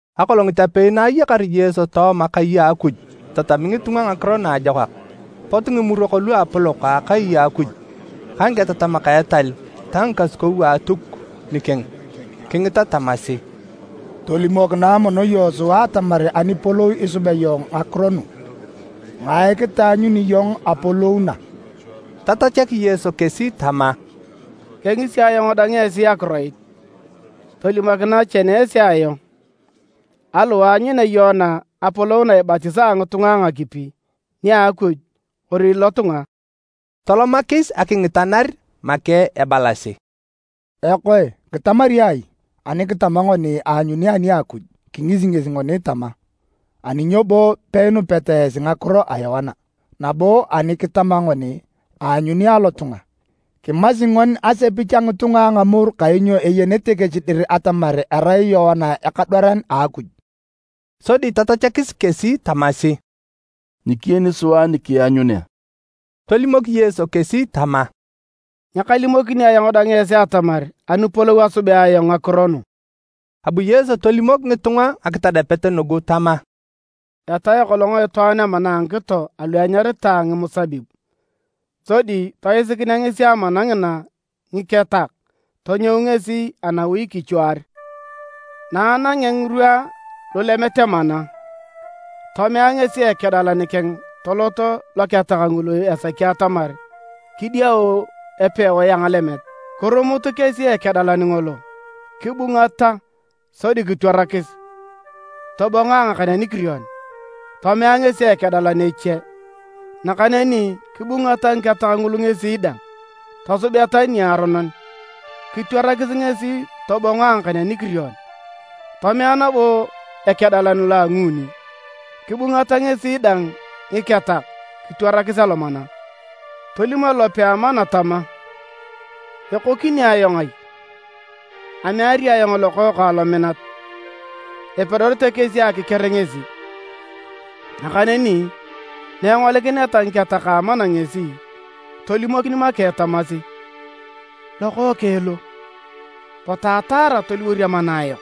Akolongit apei na ayakar Yesu tooma kai a Akuj itatami ngitunga Ngakiro Naajokak, pot Ngimurok Luapolok a akai a Akuj ka ngiketatamak a etal ta ngikasukou a Atuk nikeng kingita tamasi, “Tolimokinae mono iyong sua atamar anipolou isubea iyong ngakiro nu? Ngae kitaanyuni iyong apolou na?” Tatachak Yesu kesi tama, “Kengisi ayong dang esi akiroit. Tolimokinae chene esi ayong, aliwae aanyunea Yoana apolou na ibatisaa ngitunga a ngakipi, nia Akuj kori lotunga?” Tolomakis akingitanar make ebalasi, “Ekoe, kitamari ai? Ani kitama ngoni, ‘Aanyuni ani a Akuj,’ kingisi ngesi ngoni tama, ‘Ani nyo bo peinupeta esi ngakiro a Yoana?’ Nabo ani kitama ngoni, ‘Aanyuni alotunga,’ kimasi ngoni asepich a ngitunga a ngamoru kainyo eyenete kesi dir atamar arai Yoana ekadwaran a Akuj.” Sodi tatachakis kesi tamasi, “Nyikiyeni sua ni keanyunea.” Tolimok Yesu kesi tama, “Nyakalimokini ayong dang esi atamar anipolou asubea ayong ngakiro nu.” Abu Yesu tolimok ngitunga ngakitadapet nugu tama: “Etae kolong itwaan amana a ngikito alu enyaritae ngimusabib, sodi toisikinea amana ngina ngiketak tonyou ngesi anawi kichuar. Na anangea ngirwa lulemet amana, tomea ngesi ekedalan keng tolot loketak ngulu esaki atamar kidiau epewae a ngalemet. Kirumut kesi ekedalan ngolo, kibungata sodi kitwarakis tobongo a ngakan anikirion. Tomea ngesi ekedalan eche, nakaneni kibungata ngiketak ngulu ngesi dang, tosubeta niaronon, kitwarakis ngesi tobongo a ngakan anikirion. Tomea nabo ekedalan lo a nguuni, kibungata ngesi dang ngiketak, kitwarakis alomana. Tolim elope a amana tama, ‘Ekokini ayong ai? Ameari ayong Lokookang lominat, epedorete kesi akiker ngesi!’ Nakaneni na engolikineta ngiketak a amana ngesi tolimokin make tamasi, ‘Lokookeng lo! Potu ataara toliwor amana ayok!’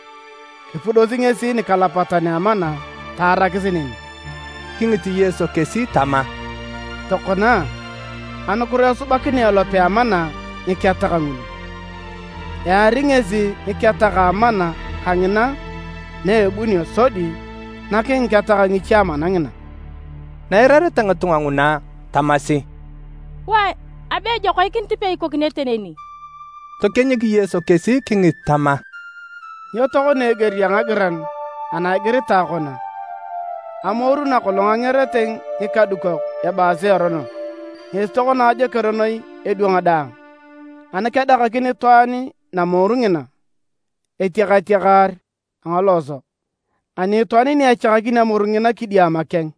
Kipudosi ngesi nikalapatan a amana taarakis neni.” Kingit Yesu kesi tama, “Tokona a, anukiro esubakinea elope a amana ngiketak ngulu? Eari ngesi ngiketak a amana kangina na ebunio sodi nak ngiketak ngiche amana ngina.” Na eirareta ngitunga nguna, tamasi, “Wae, abe ejoikinit peikokinete neni!” Tokienyik Yesu kesi kingit tama, “Nyo tokona eger a ngagiran ana igiritae kona? ‘Amoru nakolong angerete ngikadukok ebaasi erono, ngesi tokona ajoker noi edwang daang.’ Ani kedakakin itwaan namoru ngina, etiakatiakar a ngalooso, ani itwaan ni echakakin amoru ngina kidiama keng,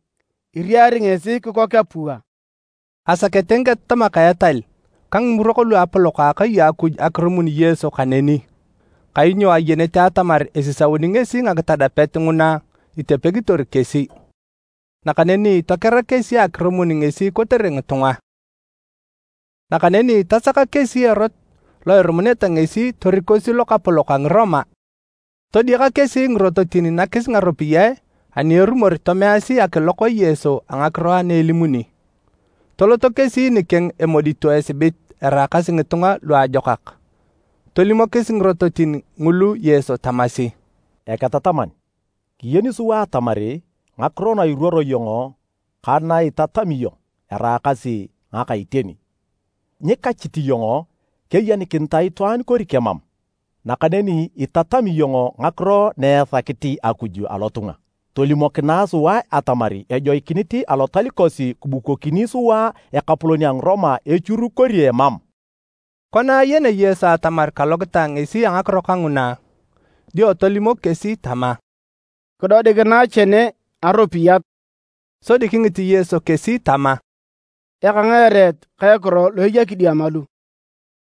iriari ngesi kikok apua.” Asakete ngiketatamak a etal ka Ngimurok Luapolok a Akai a Akuj akirumun Yesu kaneni, kainyo ayenete atamar esisauni ngesi ngakitadapet nguna itepegitor kesi. Nakaneni tokera kesi akirumun ngesi kotere ngitunga. Nakaneni tasaka kesi erot lo irumuneta ngesi torikosi lokapolok a Ngiroma. Todiaka kesi ngirototin nakis ngaropiyae ani erumor tomeasi akilok Yesu a ngakiro ana elimuni. Toloto kesi nikeng emodito esibit eraakasi ngitunga luajokak. Tolimokis ngirototin ngulu Yesu tamasi, “Eketataman, kiyeni sua atamar ngakiro na iruoro iyong ka na itatami iyong eraakasi ngaka iteni. Nyikachit iyong keyenikinitae itwaan kori kemam, nakaneni itatami iyong ngakiro na esakit Akuj alotunga. Tolimokinae sua atamar ejoikinit Alotal kosi kibukokini sua ekapolon a Ngiroma echur kori emam?” Kona ayenea Yesu atamar kalokitae ngesi a ngakiro kanguna, dio tolimok kesi tama, “Kidodikinae chene aropiyat.” Sodi kingit Yesu kesi tama, “Eka ngae ereet ka ekiro lu eya kidiama lu?”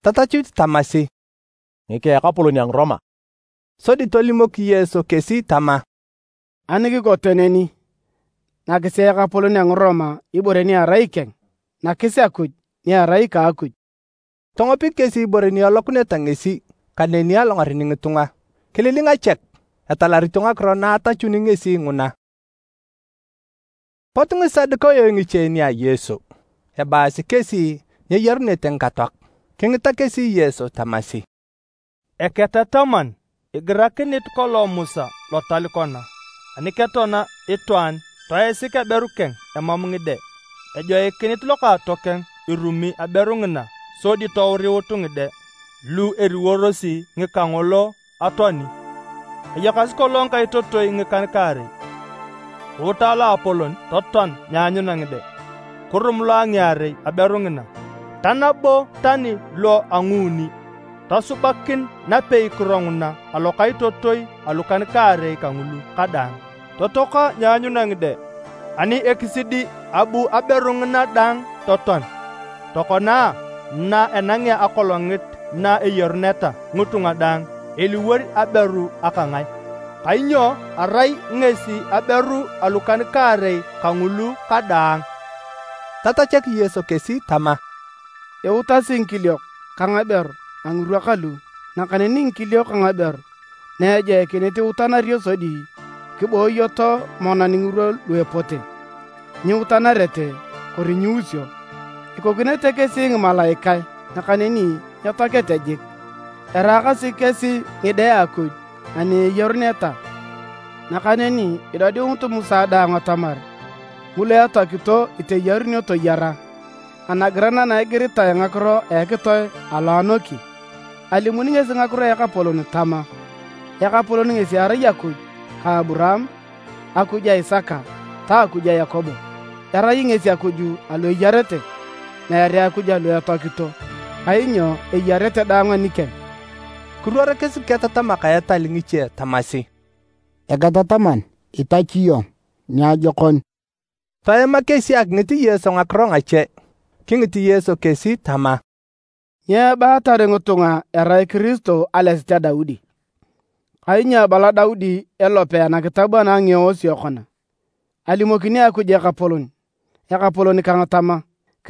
Tatachut tamasi, “Ngika ekapolon a Ngiroma.” Sodi tolimok Yesu kesi tama, “Ani kikote neni, nakisi ekapolon a Ngiroma ibore ni erai ikeng, nakis Akuj ni erai ika a Akuj.” Tongopik kesi ibore ni elokuneta ngesi kaneni alongaren ngitunga. Kililinga chek, etalarito ngakiro na atachuni ngesi nguna. Pot Ngisadukayo ngiche nia Yesu. Ebaasi kesi nyeyarunete ngikatoak. Kingita kesi Yesu tamasi, “Eketataman, igirakinit kolong Musa lotal kona, ‘Ani ketoana itwaan toisik aberu keng emam ngide, ejoikinit lokaatokeng irumi aberu ngina sodi touriut ngide lu eliworosi ngika ngolo atoani.’ Ayakasi kolong ngikaitotoi ngikan-kaarei, kuuta loapolon totoan nyeanyuna ngide. Kirum lo a ngiarei aberu ngina, ta nabo tani lo a nguuni. Tosubakin napeikiro nguna alokaitotoi alukan-kaarei kangulu kadaang, totoaka nyeanyuna ngide. Ani ekisidi, abu aberu ngina dang totoan. Tokona a, na enangea akolongit na eyaruneta ngitunga daang, eliwor aberu aka ngae? Kainyo arai ngesi aberu alukan-kaarei kangulu kadaang.” Tatachak Yesu kesi tama, “Iutasi ngikiliok ka ngaberu a ngirwa kalu, nakaneni ngikiliok ka ngaberu na ejoikinit iteyarunio sodi kibooyoto monan ngirwa lu epote, nyiutanarete kori nyiusio. Ikokinete kesi ngimalaikae nakaneni nyetoakete jik. Eraakasi kesi ngide a Akuj ani eyaruneta. Nakaneni idodiunit Musa dang atamar ngulu etoakito iteyarunio toyara, anagiran ana igiritae ngakiro a ekitoe alo anoki, alimuni ngesi ngakiro a Ekapolon tama, ‘Ekapolon ngesi erai Akuj ka Aburaam, Akuj a Isaka ta Akuj a Yakobo.’ Erai ngesi Akuj alu eyarete, meere Akuj alu etoakito, kainyo eyarete daang anikeng.” Kiruorikis ngiketatamak a etal ngiche tamasi, “Eketataman, itachu iyong niajokon!” Toema kesi akingit Yesu ngakiro ngache. Kingit Yesu kesi tama, “Nyo ebaatar ngitunga erai Kiristo alesit a Daudi? Kainyo abala Daudi elope anakitab ana a Ngieosio kona, ‘Alimokini Akuj Ekapolon Ekapolon kang tama,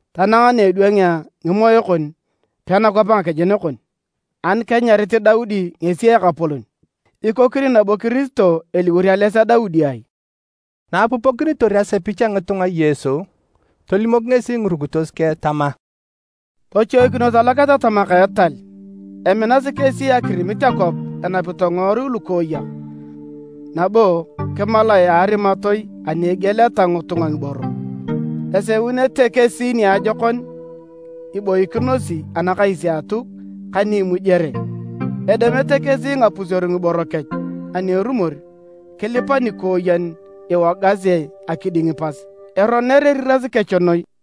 tanang na edwangea ngimoe kon pena kwap ngakejen kon!’ Ani kenyarit Daudi ngesi ‘Ekapolon’, ikokini nabo Kiristo eliwor ales a Daudi ai?” Na apupokinitor asepich a ngitunga Yesu, tolimok ngesi ngirukitos keng tama, “Tochoikinos aloketatamak a etal, eminasi kesi akirimit akwap enapito ngiworui lukooyak, nabo kimalae a arimatoi ani egieleta ngitunga ngiboro. Eseunete kesi niajokon ni iboikinosi anakais a Atuk ka ni imujere. Edemete kesi ngapuseru ngiboro kech, ani erumor, kilipa nikooyen iwogasi akiding pas! Eroner eriras kech noi!”